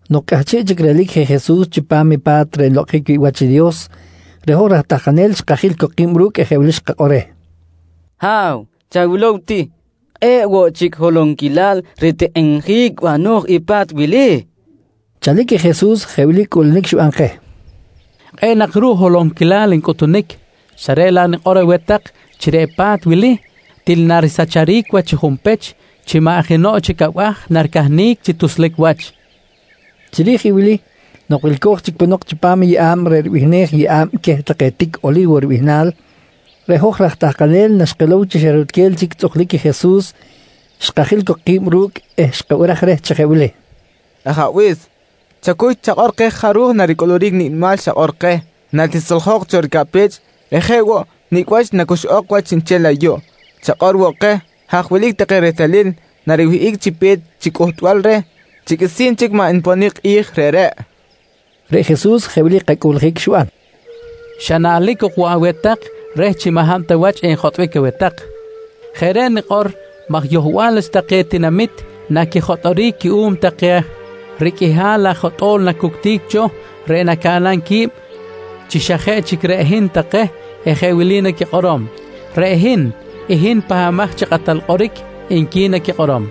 Nok cꞌahchiꞌ chic relic je Jesus chipam i pa̱t reꞌ nlokꞌonjic wi̱ꞌ wach i Dios reꞌ hoj raj tahkanel xkajil cok ki̱b ru̱cꞌ eh jeꞌ wili xkakꞌor reh: «Ha̱w, chawilow ti! Kꞌe̱ꞌ woꞌ chic holonquilal ritikꞌinjic bano̱j i pa̱t wili, kojqui reh. Chalic i Jesus jeꞌ wili cꞌuꞌlunic xiban keh: «Kꞌe̱ꞌ nak ruꞌ holonquilal ncꞌutunic, xa reꞌ laꞌ nikꞌor aweh tak chi reꞌ pa̱t wili til narisacharic wach chi junpech chi maꞌ jenoꞌ chic abaj naricahnic chi tuslic wach, nqui xikꞌor keh. Chiri̱j i wili, nok wilco̱j chic ponok chipam i yeꞌa̱b reꞌ ribihnej “Yeꞌa̱b queh take tic Oli̱wo ribihnal”, reꞌ hoj raj tahkanel naxkilow chi xa rutquel chic tzꞌuklic i Jesus, xkajil cok ki̱b ru̱cꞌ eh xkabiraj reh chi jeꞌ wili: «Ajabe̱s, chacuy chakꞌor keh jaruj naricꞌuluric nicꞌ nimal xakꞌor keh chiri̱j i kꞌi̱j natisoljok cho ricaꞌpech eh jeꞌ woꞌ nicꞌ wach nacuxꞌok wach chiꞌnchel ayuꞌ. Chakꞌor woꞌ keh, haj wilic take rehtalil nariwihꞌic chi pe̱t chi cꞌuhtbal reh chi qꞌuisi̱n chic maꞌ nponic i kꞌi̱j reꞌreꞌ? kojqui reh. Reꞌ Jesus jeꞌ wili kacꞌuꞌljic xiban: «Xa naꞌlic ok woꞌ aweh tak reh chi maꞌ hab ta wach enjotꞌbic aweh tak. Jeꞌ reꞌ nikꞌor, maj yohbal wach take tinamit naquijotꞌoric cuꞌum take riqꞌuihal aj jotꞌo̱l nacuctic cho reꞌ nacaꞌnam qui̱b chi xa jeꞌ chic reꞌ hin take eh jeꞌ wili naquikꞌorom: ‹Reꞌ hin, i hin Pahbamaj chi Kꞌatal Kꞌoric, nqui naquikꞌorom.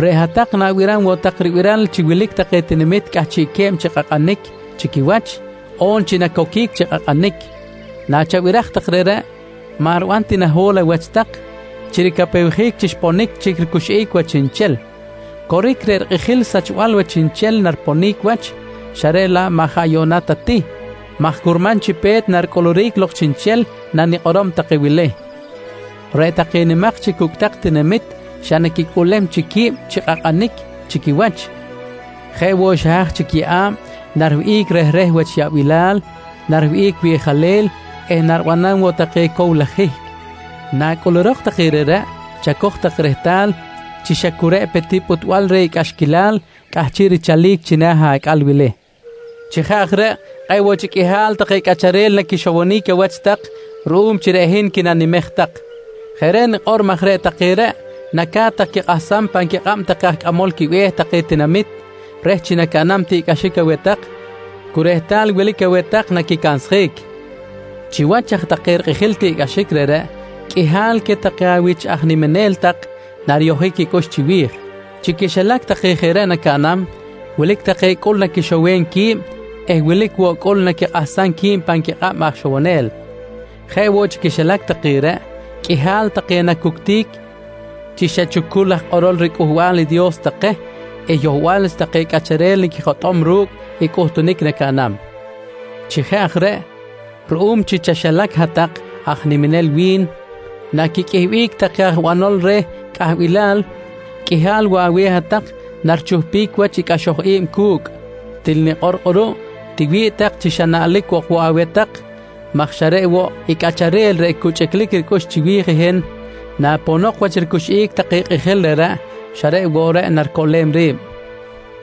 «Reꞌ hat-tak na̱biram woꞌ tak ribiral chi wilic take tinamit cꞌahchiꞌque̱b chi kꞌakꞌanic chi quiwach on chi nacoquic chi kꞌakꞌanic. Nachabiraj tak reꞌreꞌ, maꞌ riban ti naho̱l awach tak chi ricapewjic chi xponic chic ricuxꞌic wach chiꞌnchel. Coric, reꞌ rikꞌijil sachbal wach chiꞌnchel nariponic wach xa reꞌ laꞌ maꞌ jaꞌ yuꞌna ta ti maj curman chi pe̱t naricꞌuluric lok chiꞌnchel nanikꞌorom take wili: Reꞌ take nimak chi cucꞌtak tinamit xa naquicꞌuꞌlem chic qui̱b chi kꞌakꞌanic chi quiwach. Jeꞌ woꞌ xa haj chic yeꞌa̱b, nariwihꞌic rehreh wach yaꞌbilal, nariwihꞌic wiꞌjalel eh naribanam woꞌ take cow laj hihc. Nacꞌulurok take reꞌreꞌ chacoj tak rehtal chi xa cu reꞌ pe ti pꞌuhtbal reh i cꞌaxquilal cꞌahchiꞌ richalic china̱ acꞌal wili. Chi jeꞌ aj reꞌ, kꞌe̱ꞌ woꞌ chic qꞌuihal take cꞌacharel naquixowonic awach tak ruꞌum chi reꞌ hin quinanimej tak. Jeꞌ reꞌ nikꞌor maj reꞌ take reꞌ naca̱t tak quikꞌahsam pan quikꞌab take aj cꞌamol quibe̱h take tinamit reh chi nacaꞌnam tiꞌcꞌaxic aweh tak cu rehtal wilic aweh tak naquicansjic. «Chiwach aj take rikꞌijil i tiꞌcꞌaxic reꞌreꞌ, qꞌuihal queh take awich aj niminel tak nariyojic quicꞌux chiwi̱j. Chi quixilac take jeꞌ reꞌ nacaꞌnam, wilic take cꞌul naquixowem qui̱b eh wilic woꞌ cꞌul naquikꞌahsam qui̱b pan quikꞌab aj ixowonel. Jeꞌ woꞌ chi quixilac take reꞌ, qꞌuihal take nacuctic chi xa chucul aj kꞌorol riCꞌuhbal i Dios take eh yohbal wach take cꞌacharel naquijotꞌom ru̱cꞌ i cꞌuhtunic nacaꞌnam. Chi jeꞌ aj reꞌ, ruꞌum chi chaxilac hat-tak aj niminel wi̱n naquiqꞌuihbic take aj banol reh cꞌahbilal, qꞌuihal woꞌ aweh hat-tak narichuhpic wach i cꞌaxoj i̱b cu̱cꞌ. Til nikꞌor kꞌuruꞌ, tiwi̱ꞌ tak chi xa naꞌlic ok woꞌ aweh tak maj xa reꞌ woꞌ i cꞌacharel reꞌ cu chꞌiclic ricꞌux chiwi̱j hin naponok wach ricuxꞌic take kꞌijil reꞌreꞌ, xa reꞌ woꞌ reꞌ naricoꞌlem ri̱b.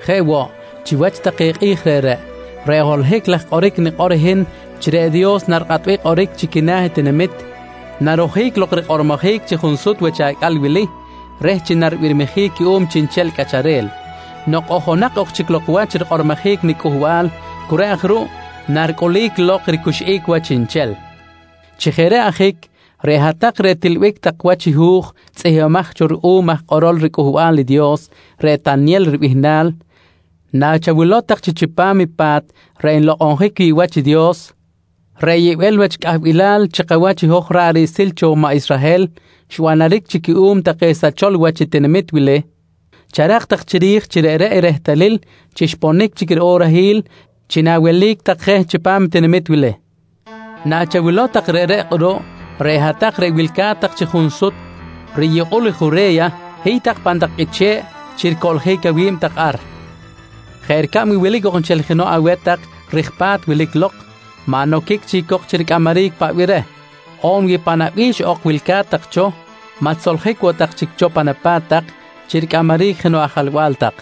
«Jeꞌ woꞌ, chiwach take kꞌi̱j reꞌreꞌ, reꞌ holohic laj kꞌoric nikꞌor i hin chi reꞌ Dios narikꞌatbic kꞌoric chi quina̱ i tinamit, narojic lok rikꞌormojic chi junsut wach acꞌal wili reh chi naribirmijic cuꞌum chiꞌnchel cꞌacharel. Nok ojonak ok chic lok wach rikꞌormojic niCꞌuhbal, cu reꞌ aj ruꞌ naricꞌulic lok i ricuxꞌic wach chiꞌnchel. Chi jeꞌ reꞌ ajic, reꞌ hat-tak reꞌ tilbic tak wach i hu̱j tzꞌihmbimaj cho ruꞌum aj kꞌorol riCꞌuhbal i Dios reꞌ Tanyel ribihnal, nachawilow tak chi chipam i pa̱t reꞌ nlokꞌonjic wi̱ꞌ wach i Dios, reꞌ yibel wach cꞌahbilal chi kawach hoj ra̱ꞌ riꞌsil cho maꞌ Israhel xbanaric chic cuꞌum take sachol wach i tinamit wili, charak tak chiri̱j chi reꞌreꞌ i rehtalil chi xponic chic i orahil chi nawelic tak je chipam i tinamit wili. Nachawilow tak reꞌreꞌ kꞌuruꞌ, reꞌ hat-tak reꞌ wilca̱t tak chi junsut riyukꞌul Jure̱ya hiy tak pan tak qꞌuiche̱ꞌ chi ricꞌoloric awi̱b tak ar. Jeꞌ ricab wi wilic ok nchel jenoꞌ aweh tak rij ripa̱t wilic lok, maꞌ noquic chic cok chi ricꞌamaric paꞌ bih aweh tak. On wi pan awabi̱x ok wilca̱t tak cho maꞌ tisoljic woꞌ tak chic cho pan apa̱t tak chi ricꞌamaric jenoꞌ ajalba̱l tak.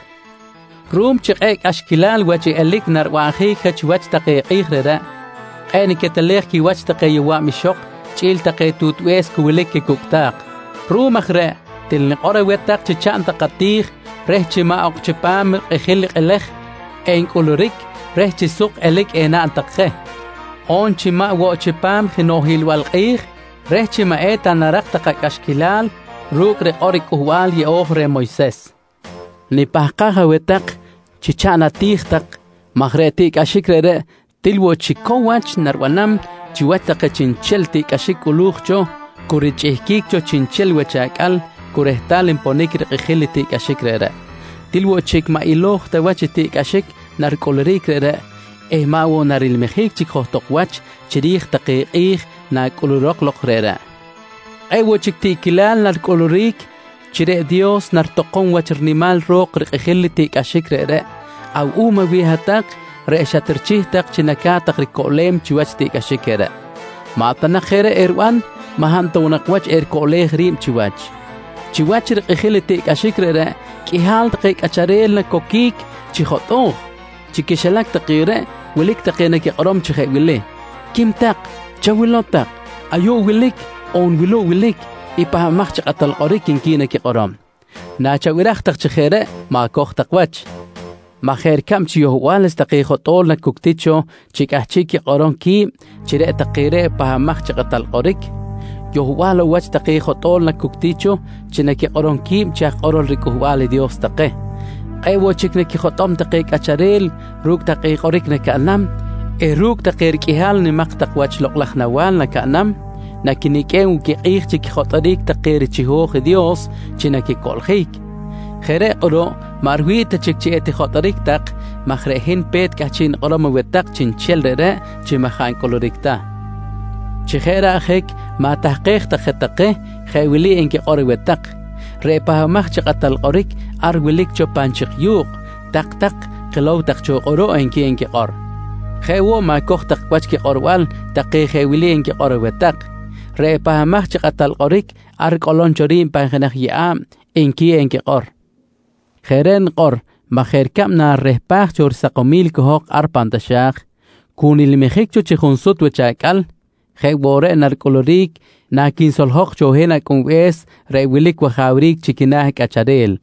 «Ruꞌum chi kꞌe̱ꞌ cꞌaxquilal wach i elic naribanjic chiwach take kꞌi̱j reꞌreꞌ, kꞌe̱ꞌ niquetelej quiwach take yowa̱b ixok chꞌi̱l take tutbe̱s cu wilic quicucꞌta̱k. Ruꞌum aj reꞌ, til nikꞌor aweh tak chi chaꞌn tak ati̱j reh chi maꞌ ok chipam rikꞌijil i kꞌelej encꞌuluric reh chi suk elic enaꞌn tak je, on chi maꞌ woꞌ chipam jenoꞌ hiꞌlbal kꞌi̱j reh chi maꞌ eta narak tak acꞌaxquilal ru̱cꞌ rikꞌor i Cꞌuhbal Yeꞌo̱j reh Moyses. Nipahkaj aweh tak chi chaꞌn ati̱j tak maj reꞌ tiꞌcꞌaxic reꞌreꞌ til woꞌ chic cow wach naribanam chiwach take chiꞌnchel tiꞌcꞌaxic cꞌulu̱j cho cu richꞌihquic cho chiꞌnchel wach acꞌal cu rehtal nponic rikꞌijil i tiꞌcꞌaxic reꞌreꞌ. Til woꞌ chic maꞌ ilo̱j ta wach i tiꞌcꞌaxic naricꞌuluric reꞌreꞌ eh maꞌ woꞌ narilmijic chic johtok wach chiri̱j take kꞌi̱j nacꞌulurok lok reꞌreꞌ. Kꞌe̱ꞌ woꞌ chic tiꞌquilal naricꞌuluric chi reꞌ Dios naritokom wach rinimal ro̱k rikꞌijil tiꞌcꞌaxic reꞌreꞌ awuꞌum aweh hat-tak reꞌ xatrichih tak chi naca̱t tak ricoꞌlem chiwach i tiꞌcꞌaxic reꞌreꞌ. Maꞌ ta jeꞌ reꞌ eriban, maꞌ hab ta woꞌ nak wach ericoꞌlej ri̱b chiwach. «Chiwach rikꞌijil i tiꞌcꞌaxic reꞌreꞌ, qꞌuihal take cꞌacharel nacoquic chi jotꞌo̱j. Chi quixilac take reꞌ, wilic take naquikꞌorom chi jeꞌ wili: ‹Quim tak, chawilow tak: Ayuꞌ wilic on wuluꞌ wilic i Pahbamaj chi Kꞌatal Kꞌoric, nqui naquikꞌorom. «Nachabiraj tak chi jeꞌ reꞌ ma̱coj tak wach maj jeꞌ ricab chi yohbal wach take jotꞌo̱l nacuctic cho chi cꞌahchiꞌ quikꞌorom qui̱b chi reꞌ take reꞌ i Pahbamaj chi Kꞌatal Kꞌoric, yohbal woꞌ wach take jotꞌo̱l nacuctic cho chi naquikꞌorom qui̱b chi aj kꞌorol riCꞌuhbal i Dios take. Kꞌe̱ꞌ woꞌ chic naquijotꞌom take cꞌacharel ru̱cꞌ take kꞌoric nacaꞌnam eh ru̱cꞌ take riqꞌuihal nimak tak wach lokꞌ laj nawa̱l nacaꞌnam, naquiniqꞌuem woꞌ quikꞌi̱j chi quijotꞌoric take richiho̱j i Dios chi naquicoꞌljic. Jeꞌ reꞌ kꞌuruꞌ maꞌ riwi̱ꞌ ta chic chi etijotꞌoric tak maj reꞌ hin pe̱t cꞌahchiꞌ nikꞌorom aweh tak chiꞌnchel reꞌreꞌ chi jaꞌ ncꞌuluric ta. Chi jeꞌ reꞌ ajic ma̱tahkej tak je take jeꞌ wili enquikꞌor aweh tak: ‹Reꞌ Pahbamaj chi Kꞌatal Kꞌoric, ar wilic cho pan chik yu̱kꞌ, tak-tak kilow tak cho kꞌuruꞌ, nqui enquikꞌor. «Jeꞌ woꞌ ma̱coj tak wach quikꞌorbal take jeꞌ wili enquikꞌor aweh tak: ‹Reꞌ Pahbamaj chi Kꞌatal Kꞌoric ar ricꞌolom cho ri̱b pan jenaj yeꞌa̱b, nqui enquikꞌor. «Jeꞌ reꞌ nikꞌor maj jeꞌ ricab chi narirehpaj cho risakomil i cohok ar pan taxa̱j, cu nilmijic cho chi junsut wach acꞌal, jeꞌ woꞌ reꞌ naricꞌuluric naquinsoljok cho hin Acꞌunbe̱s reꞌ wilic wajawric chi quina̱ cꞌacharel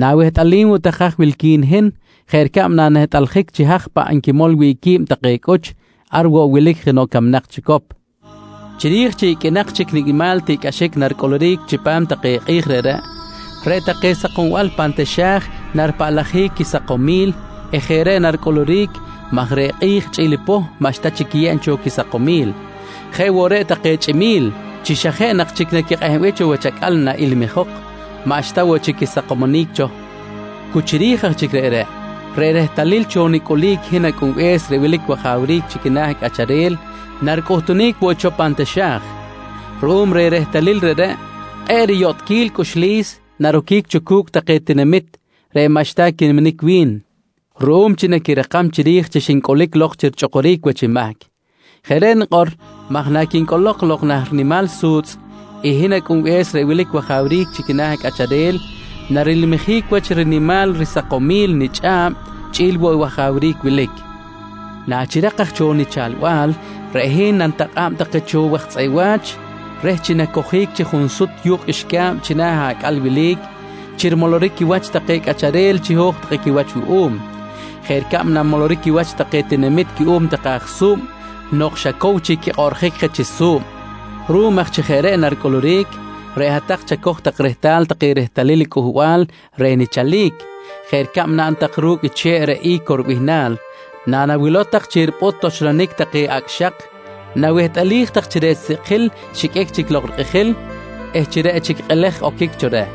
na̱wehtꞌalim woꞌ tak haj wilqui̱n hin jeꞌ ricab nanehtꞌaljic chi haj paꞌ nquimol wi̱ꞌ qui̱b take cꞌuch, ar woꞌ wilic jenoꞌ camnak chicop. «Chiri̱j chi iqꞌuinak chic nicꞌ nimal tiꞌcꞌaxic naricꞌuluric chipam take kꞌi̱j reꞌreꞌ, reꞌ take sakombal pan taxa̱j naripaꞌlajic quisakomil eh jeꞌ reꞌ naricꞌuluric maj reꞌ kꞌi̱j chꞌi̱l i poh maꞌxta chic quiyeb cho quisakomil. Jeꞌ woꞌ reꞌ take chꞌimi̱l, chi xa jeꞌ nak chic naquikꞌehbic cho wach acꞌal naꞌilmijok, maꞌxta woꞌ chic quisakomonic cho. Cu chiri̱j aj chic reꞌreꞌ, reꞌ rehtalil cho nicꞌulic hin Acꞌunbe̱s reꞌ wilic wajawric chi quina̱ cꞌacharel naricꞌuhtunic woꞌ cho pan taxa̱j. Ruꞌum reh rehtalil reꞌreꞌ, kꞌe̱ꞌ riyotꞌquil cꞌuxlis naroquic cho cu̱cꞌ take tinamit maꞌxta quiniminic wi̱n ruꞌum chi naquirakam chiri̱j chi xincꞌulic lok chi richꞌukuric wach mahc. Jeꞌ reꞌ nikꞌor maj naquincꞌolok lok nah rinimal su̱tzꞌ i hin Acꞌunbe̱s reꞌ wilic wajawric chi quina̱ cꞌacharel, narilmijic wach rinimal risakomil nichꞌa̱b chꞌi̱l woꞌ i wajawric wilic. «Nachirak aj cho nichalbal, reꞌ hin nanitakꞌa̱b take cho waj tzꞌeꞌ wa̱ch reh chi nacojic chi junsut yu̱kꞌ qꞌuixca̱b china̱ acꞌal wili chi rimoloric quiwach take cꞌacharel chiho̱j take quiwach wuꞌum, jeꞌ ricab nanmoloric quiwach take tinamit cuꞌum take aj su̱b nok xa cow chic quikꞌoꞌrjic je chi su̱b. Ruꞌum aj chi jeꞌ reꞌ naricꞌuluric, reꞌ hat-tak chacoj tak rehtal take rehtalil cꞌuhtbal reh nichalic jeꞌ ricab naꞌn tak ru̱cꞌ i che̱ꞌ reꞌ I̱co ribihnal. Nanawilow tak chi ripꞌut cho toxlonic take acꞌ xak, nawehtꞌalij tak chi reꞌ sikꞌjil xiqꞌuic chic lok rikꞌijil eh chi reꞌ chic kꞌelej oquic cho reh.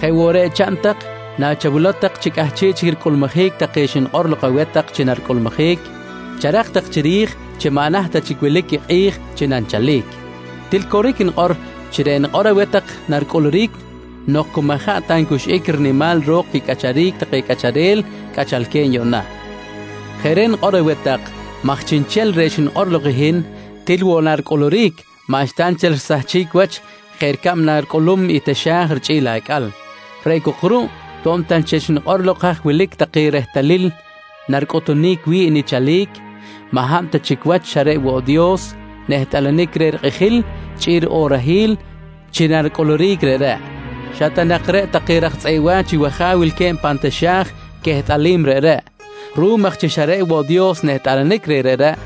Jeꞌ woꞌ reꞌ chaꞌn tak chi nachawilow tak chi cꞌahchiꞌ chic ricꞌulmujic take xnikꞌor lok aweh tak chi naricꞌulmujic, charak tak chiri̱j chi maꞌ naht ta chic wilic i kꞌi̱j chi nanichalic. Til coric nikꞌor chi reꞌ xnikꞌor aweh tak naricꞌuluric nok cu jaꞌ ta ncuxꞌic rinimal ro̱k quicꞌacharic take cꞌacharel cꞌachalque̱b yuꞌna. Jeꞌ reꞌ nikꞌor aweh tak maj chiꞌnchel reꞌ xnikꞌor lok i hin, til woꞌ naricꞌuluric maꞌxta nchel risahchic wach jeꞌ ricab naricꞌulum i taxa̱j richꞌi̱l i acꞌal. Reꞌ cok ruꞌ to̱b ta nchel xnikꞌor lok haj wilic take rehtalil naricꞌutunic wi̱ꞌ nichalic, maꞌ hab ta chic wach xa reꞌ woꞌ Dios nehtꞌalanic reh rikꞌijil chꞌi̱l riꞌorahil chi naricꞌuluric reꞌreꞌ. Xa ta nak reꞌ take raj tzꞌeꞌ wa̱ch i wAja̱w wilque̱b ar pan taxa̱j, quehtꞌalim reꞌreꞌ. Ruꞌum aj chi xa reꞌ woꞌ Dios nehtꞌalanic reh reꞌreꞌ,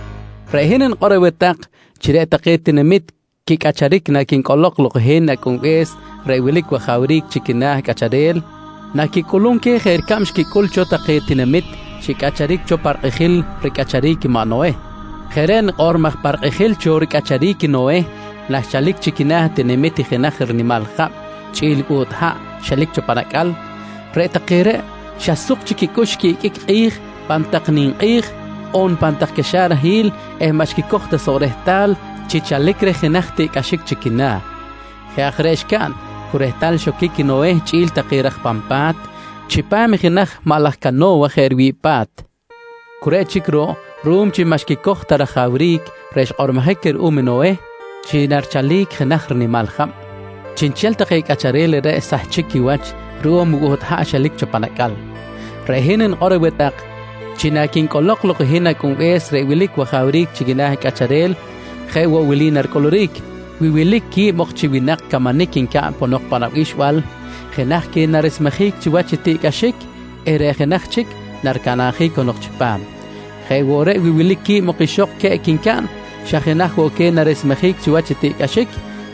reꞌ hin nikꞌor aweh tak chi reꞌ take tinamit quicꞌacharic naquincꞌolok lok i hin Acꞌunbe̱s reꞌ wilic wajawric chi quina̱ cꞌacharel, naquicꞌulum queh jeꞌ ricab xquicꞌul cho take tinamit xicꞌacharic cho pa rikꞌijil cho ricꞌacharic i maꞌ Noheh. Jeꞌ reꞌ nikꞌor maj pa rikꞌijil cho ricꞌacharic i Noheh naxchalic chi quina̱ tinamit i jenaj rinimal jab chꞌi̱l buht haꞌ xelic cho pan acꞌal, reꞌ take reꞌ xa suk chic quicꞌux quiꞌiqꞌuic kꞌi̱j pan tak ninkꞌi̱j on pan tak caxarahil eh maꞌ xquicoj ta soꞌ rehtal chi chalic reh jenaj tiꞌcꞌaxic chi quina̱. Jeꞌ aj reꞌ xcaꞌn cu rehtal xoquic i Noheh chꞌi̱l take raj pan pa̱t chipam i jenaj maꞌ laj cano̱wa jeꞌ riwi̱ꞌ pa̱t. Cu reꞌ chic ruꞌ, ruꞌum chi maꞌ xquicoj ta rajawric reꞌ xkꞌormojic queh ruꞌum i Noheh chi narichalic jenaj rinimal jab, chiꞌnchel take cꞌacharel reꞌreꞌ xsahchic quiwach ruꞌum i buht haꞌ xelic cho pan acꞌal. «Reꞌ hin nikꞌor woꞌ aweh tak chi naquincꞌolok lok i hin Acꞌunbe̱s reꞌ wilic wajawric chi quina̱ cꞌacharel, jeꞌ woꞌ wili naricꞌuluric: Wi wilic quib ok chi winak camanic ncaꞌn ponok pan abixbal, jenaj queh naresmejic chiwach i tiꞌcꞌaxic eh reꞌ jenaj chic naricanabjic cahnok chipam. Jeꞌ woꞌ reꞌ, wi wilic quib ok chi ixok queꞌc ncaꞌn, xa jenaj woꞌ queh naresmejic chiwach i tiꞌcꞌaxic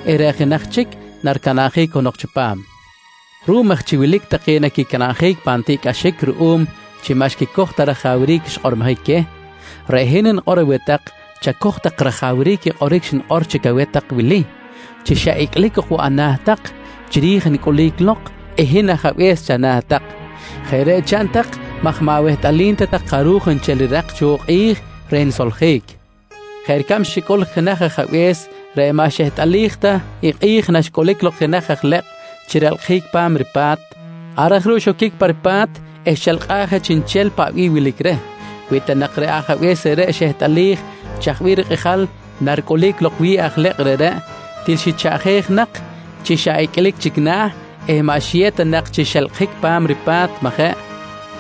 eh reꞌ jenaj chic naricanabjic cahnok chipam. «Ruꞌum aj chi wilic take naquicanabjic pan tiꞌcꞌaxic ruꞌum chi maꞌxta quicojom rajawric i xkꞌormojic queh, reꞌ hin nikꞌor aweh tak chacoj tak rajawric i kꞌoric xnikꞌor chic aweh tak wili chi xa icꞌlic ok woꞌ ana̱ tak chiri̱j nicꞌulic lok i hin ajabe̱s chana̱ tak. Jeꞌ reꞌ chaꞌn tak maj maꞌ awehtꞌalim ta tak jaruj nchel rirak cho kꞌi̱j reh nisoljic, jeꞌ ricab xicꞌul i jenaj ajabe̱s reꞌ maꞌ xehtꞌalij ta i kꞌi̱j naxcꞌulic lok jenaj aj lekꞌ chi relkꞌjic pa̱m ripa̱t. Ar aj ruꞌ xoquic pa ripa̱t eh xelkꞌaj je chiꞌnchel paꞌ bih wilic reh. Wi ta nak reꞌ ajabe̱s reꞌreꞌ xehtꞌalij chaj bih kꞌijal naricꞌulic lok wi̱ꞌ aj lekꞌ reꞌreꞌ, til xichaꞌjej nak chi xa icꞌlic chic na̱ eh maꞌ xiyew ta nak chi xelkꞌjic pa̱m ripa̱t, majeꞌ?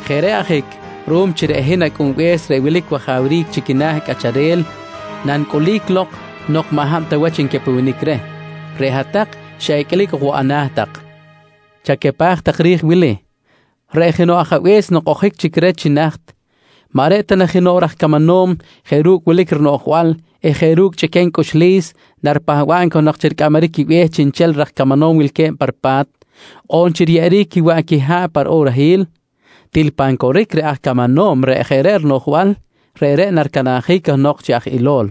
Jeꞌ reꞌ ajic, ruꞌum chi reꞌ hin Acꞌunbe̱s reꞌ wilic wajawric chi quina̱ cꞌacharel nanicꞌulic lok nok maꞌ hab ta wach ncapewenic reh, reꞌ hat-tak xa icꞌlic ok woꞌ ana̱ tak. «Chacapaj tak ri̱j i wili: Reꞌ jenoꞌ ajabe̱s nok ojic chic reh chi naht, maꞌ reꞌ ta na jenoꞌ raj camanom jeꞌ ru̱cꞌ wilic rinoꞌjbal eh jeꞌ ru̱cꞌ chꞌiquem cꞌuxlis naripahba̱b cahnok chi ricꞌamaric quibe̱h chiꞌnchel raj camanom wilque̱b pa ripa̱t, on chi riyeꞌeric quiwaꞌ quiha̱ꞌ pa riꞌorahil? Til pan coric reꞌ aj camanom reꞌ jeꞌ reꞌ rinoꞌjbal, reꞌreꞌ naricanabjic cahnok chi aj ilo̱l.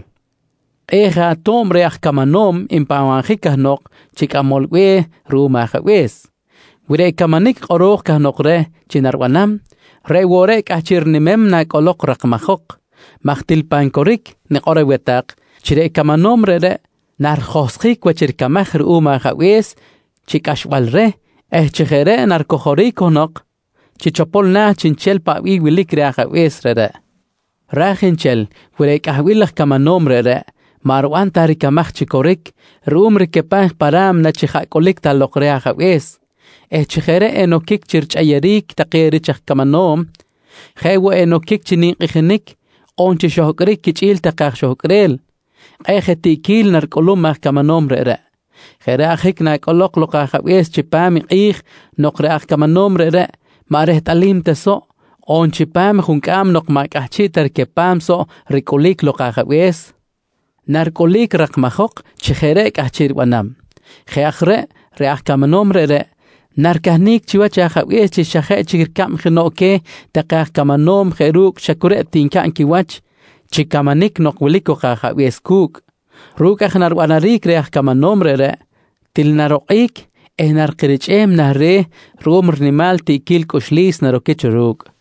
Kꞌe̱ꞌ je ato̱b reh aj camanom npahbabjic cahnok chi cꞌamol be̱h ruꞌum i ajabe̱s, wi reꞌ camanic kꞌoro̱j cahnok reh chi naribanam, reꞌ woꞌ reꞌ cꞌahchiꞌ rinimem i nacꞌolok rakmajok maj til pan coric nikꞌor aweh tak chi reꞌ camanom reꞌreꞌ narijohsjic wach ricamaj ruꞌum ajabe̱s chi cꞌaxbal reh eh chi jeꞌ reꞌ naricojoric cahnok chi chopol na̱ chiꞌnchel paꞌ bih wilic reh i ajabe̱s reꞌreꞌ. Ra̱j nchel, wi reꞌ cꞌahbil laj camanom reꞌreꞌ, maꞌ riban ta ricamaj chi coric ruꞌum ricapaj pa ra̱mna chi jaꞌ cꞌulic ta lok reh ajabe̱s eh chi jeꞌ reꞌ enoquic chi quichꞌeyeric take rich camanom jeꞌ woꞌ enoquic chi ninkꞌijinic on chi xohcꞌric quichꞌi̱l take aj xohcꞌrel, kꞌe̱ꞌ je tiꞌquil naricꞌulum aj camanom reꞌreꞌ. Jeꞌ reꞌ ajic nacꞌolok lok i ajabe̱s chipam i kꞌi̱j nok reꞌ aj camanom reꞌreꞌ maꞌ rehtꞌalim ta soꞌ, on chipam i juncꞌam nok maꞌ cꞌahchiꞌ ta ricapam soꞌ ricꞌulic lok i ajabe̱s, naricꞌulic rakmajok chi jeꞌ reꞌ cꞌahchiꞌ ribanam. Jeꞌ aj reꞌ, reꞌ aj camanom reꞌreꞌ naricahnic chiwach i ajabe̱s chi xa jeꞌ chic ricab jenoꞌ queh take aj camanom jeꞌ ru̱cꞌ xa cu reꞌ ncaꞌn quiwach chi camanic nok wilic cok i ajabe̱s cu̱cꞌ. Ru̱cꞌ aj naribanaric reh aj camanom reꞌreꞌ, til narokꞌic eh narikirichꞌem nah re̱ ruꞌum rinimal tiꞌquil cꞌuxlis naroquic cho ru̱cꞌ.